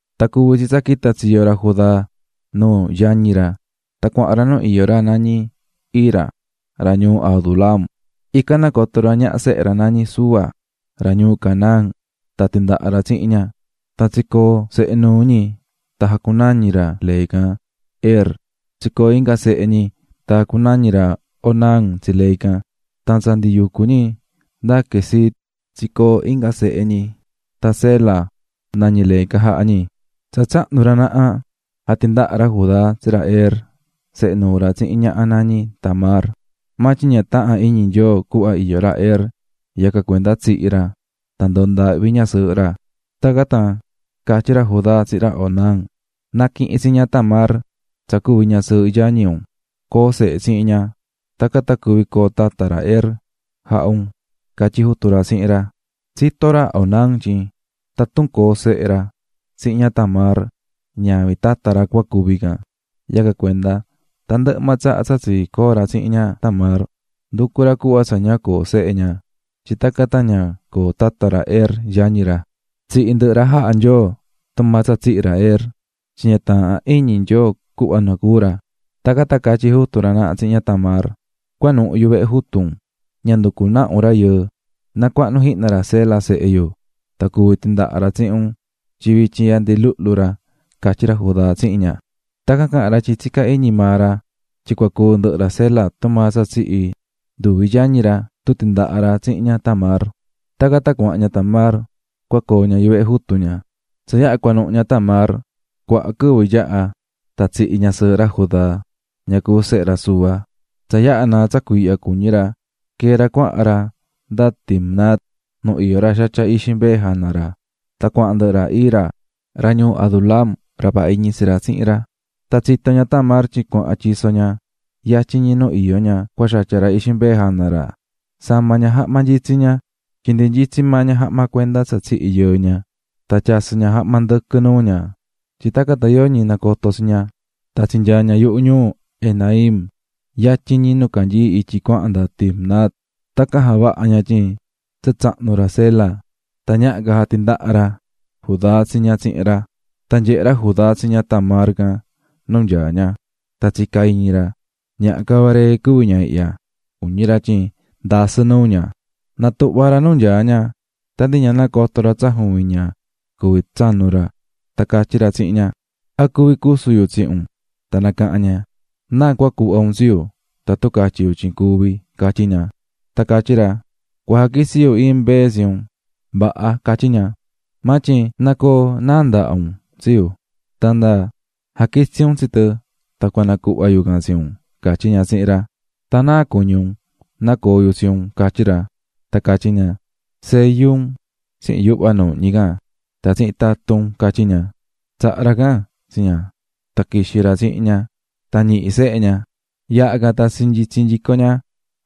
Tan cuvi̱ tsi tsa quita̱ tsiyo ra Judá nuu yañi ra tan cuahan ra nu iyó ra nañí Hira, ra ñuu Adulam. Ican nacoto̱ ra ñaha sehe ra nañí Súa, ra ñuu Canaán tan tindaha̱ ra tsihin ña, tan tsicoo̱ sehe nuu ñi tan jacunañi̱ ra lee can, Er. Tsicoo̱ inga sehe ñi tan jacunañi̱ ra Onán tsi lee can. Tan tsa ndi yucú ñi nda Quezib tsicoo̱ inga sehe ñi, tan Sela nañí lee can jaha̱ ñi. Tsa tsahnu̱ ra naha, jatindaha̱ ra Judá tsi ra Er, sehe nuu ra, tsihin ñaha nañí Tamar. Maa tyin ña taha̱n iñi Nyoo cuhva iyó ra Er, yacan cuenda tsihi̱ ra tan ndoo̱ ndaahvi ñasɨɨhɨ ra. Tacan tan catyí ra Judá tsihin ra Onán: --Na̱quihin tsi ña Tamar tsa cuvi̱ ñasɨɨhɨ yañi un, co̱o sehe tsihin ña. Tacan tan cuvi coo tata ra Er jaha un --catyí jutu ra tsihin ra. Tsitó ra Onán tyin tatun coo sehe ra tsihin ña Tamar, ñavin tata ra cua cuvi can, yacan cuenda tandɨhɨ maa tsaha tsa tsicoo̱ ra tsihin ña Tamar, nducú ra cuhva tsa ña coo sehe ña, tyin tacan tan ña coo tata ra Er, yañi ra. Tsihi̱ ndɨhɨ ra jaha̱ Nyoo tumaa tsa tsihi̱ ra Er, tyin ña taahán iñi Nyoo cuhva nacuú ra. Tacan tan catyí jutu ra naha tsihin ña Tamar: --Cua̱nuhu yuvehe jutu un, ña nducu naha un rayɨɨ, na cuahnu jihna ra Sela sehe yu tan cuvi tindaha ra tsihin un tyin vityin ihya ndi luhlu ra --catyí ra Judá tsihin ña. Tacan caha̱n ra tyin tsicá iñi maa ra tyin cua cúu ndɨhɨ ra Sela tumaa tsa tsihi̱ nduvi yañi ra tun tindaha ra tsihin ña Tamar. Tacan tan cuahan ña Tamar cua coo ña yuvehe jutu ña. Tsa yaha cuanuhu ña Tamar, cuaha quɨvɨ yaha tan tsihi̱ ñasɨɨhɨ ra Judá, ña cuví sehe ra Súa. Tsa yaha naa̱ tsa cuiihya cuñí ra, quee̱ ra cuahan ra nda Timnat nu iyó ra xatyá ixi mbee jana ra tan cuahan ndɨhɨ ra Hira, ra ñuu Adulam ra vaha iñi tsi ra, tsihin ra. Tsa tsito̱ ña Tamar tyin cuahan ra tyiso ña yatyin ñi nu iyó ña cua xatya ra ixi mbee jana ra, sama̱ ña jahma nyitsí ña, tyin ndi nyitsí maa ña jahma cuenda tsa tsihi̱ yɨɨ ña, tan tyasɨ̱ ña jahma ndɨquɨ nuu ña, tyin tacan tan yoñi nacoto tsi ña, tan tsinyaa̱ ña yuhu ñuu Enaim, yatyin ñi nu canyií ityi cuahan nda Timnat. Tacan javaha̱ ña tyin tsa tsahnu̱ ra Sela, tan ñaha ca jatindaha ra Judá tsi ña tsihin ra. Tan nyehe̱ ra Judá tsi ña Tamar can nu nyaá ña, tan tsica̱ iñi ra: "Ñaha cavaree cuví ña ihya", cuñí ra tyin ndasɨ́ nuu ña. Natuhva̱ ra nu nyaá ña tan ndi ña nacoto̱ ra tsa juvin ña cuví tsanu ra, tan catyí ra tsihin ña: ―¿A cuvi cusu yu tsihin un? Tan nacaha̱n ña: --¿Náa cua cuhva un tsi yu tatun catyi yu tyin cuvi? --catyí ña. Tan catyí ra: --Cua jaquitsi yu iin mbee tsi un. --Vaha --catyí ña--, maa tyin na̱coo náa ndahá un tsi yu tan nda jaquitsi un tsi tɨ tan cua nacuhva yu can tsi un --catyí ña tsihin ra. --Tan ¿náa cuñí un nacoo yu tsihin un? --catyí ra. Tan catyí ña: --Seyu un tsihin yuhva nuuhñí can tan tsihin tatun un --catyí ña. Tsaha̱ ra can tsi ña, tan quixi̱ ra tsihin ña, tan ñihi̱ sehe ña. Yaha can tan tsinyitsi̱ nyico ña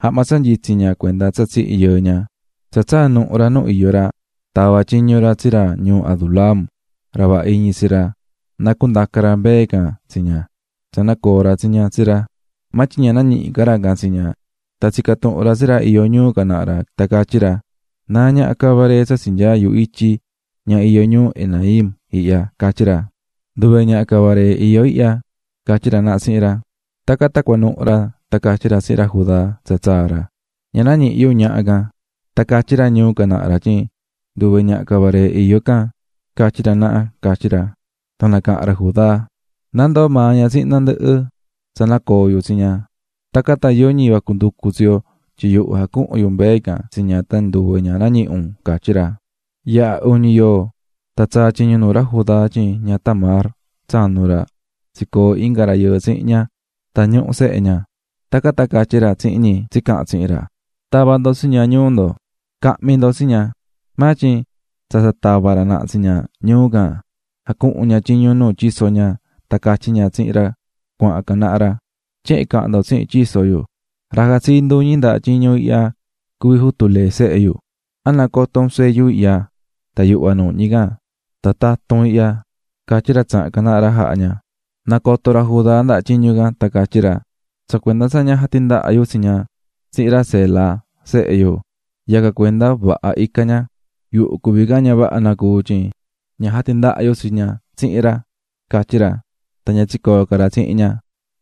jahma tsa nyitsí ña cuenda tsa tsihi̱ yɨɨ ña. Tsa tsaa̱ nuhu ra nu iyó ra, tava̱ tyiñu ra tsi ra ñuu Adulam ra vaha iñi ra na cundaca ra mbee can tsi ña, tan na nacuhva nyico ña tsa nacoo̱ ra tsi ña tsi ra, maa tyin ña nañihi̱ ra can tsi ña. Tan tsica̱ tuhun ra tsi ra iyó ñuu can naha ra, tan catyí ra: --¿Náa ñaha cavaree tsa tsinyaá yuhu ityi, ña iyó ñuu Enaim ihya? --catyí ra. --Nduve ñaha cavaree iyó ihya --catyí ra naha tsihin ra. Tacan tan cuanuhu̱ ra tan catyí ra tsihin ra Judá tsa tsaa̱ ra: --Ña nañihi̱ yu ñaha can, tan catyí ra ñuu can naha ra tyin nduve ñaha cavaree iyó can catyí ra naha ―catyí ra. Tan nacaha̱n ra Judá: --Na ndoo maa ña tsihin tandɨhɨ tsa nacoo̱ yu tsi ña, tacan tan yoñi vacu nducu tsi yo, tyin yuhu jacuhu̱n yu mbee can tsi ña tan nduve ña nañihi̱ un --catyí ra. Yaha̱ uñi yoo, tan tsaa̱ tyiñu nuu ra Judá tyin ña Tamar, tsanu ra, tsicoo̱ inga rayɨɨ tsihin ña tan ñuhú sehe ña. Tacan tan catyí ra tsihin ñi tsicaha̱n tsihin ra: --¡Ta̱va ndo tsi ña ñuu ndo, ca̱hmi ndo tsi ña! Maa tyin tsa tsa tavá ra naha tsi ña ñuu can, jacuhu̱n ña tyiñu nuu tyiso ña, tan catyí ña tsihin ra cuahan can naha ra: Tyehen cahan ndo tsihin tyiso yu: "Ra jatsií nduñi ndaha tyiñu ihya cuví jutu lee sehe yu. ¿A nacoto un seyu ihya tan yuhva nuuhñí can tan tatun ihya?" catyí ra tsaha̱n can naha ra jaha̱ ña. Nacoto̱ ra Judá ndaha tyiñu can tan catyí ra: "Tsa cuenda tsa ña jatindaha yu tsi ña tsihin ra Sela, sehe yu, yacan cuenda vaha ica̱ ña, yuhu cuví can ña vaha nacuu̱ tyin ña jatindaha̱ yu tsi ña tsihin ra", catyí ra. Tan ña tsicoo̱ ca ra tsihin ña.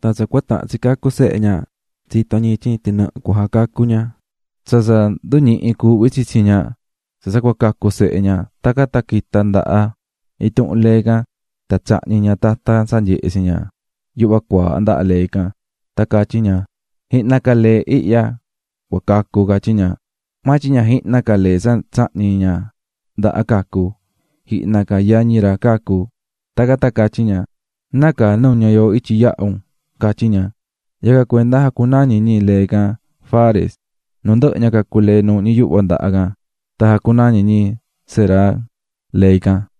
Tan tsa cua tahan tsi cacu sehe ña tsito̱ ñi tyin tinɨhɨ cua jacacu ña. Tsa tsa nduñihi̱ cuuhví tsitsi ña tsa tsa cua cacu sehe ña tacan tan quita̱ ndaha intuhun lee can tan tsahñi̱ ña tatan tsa nyehé tsi ña yuhva cuaaha ndaha lee can, tan catyí ña: "Jihna ca lee ihya cua cacu", catyí ña. Maa tyin ña jihna ca lee tsa tsahñi̱ ña ndaha cacu̱, jihna ca yañi ra cacu̱, tacan tan catyí ña: "¡Nácaa nuña̱ yooho ityi yaha̱ un!", catyí ña. Yacan cuenda jacunañi̱ ñi lee can Fares. Nu ndɨhɨ ña, cacu̱ lee nuuhñí yuhva ndaha can, tan jacunañi̱ ñi Zerah lee can.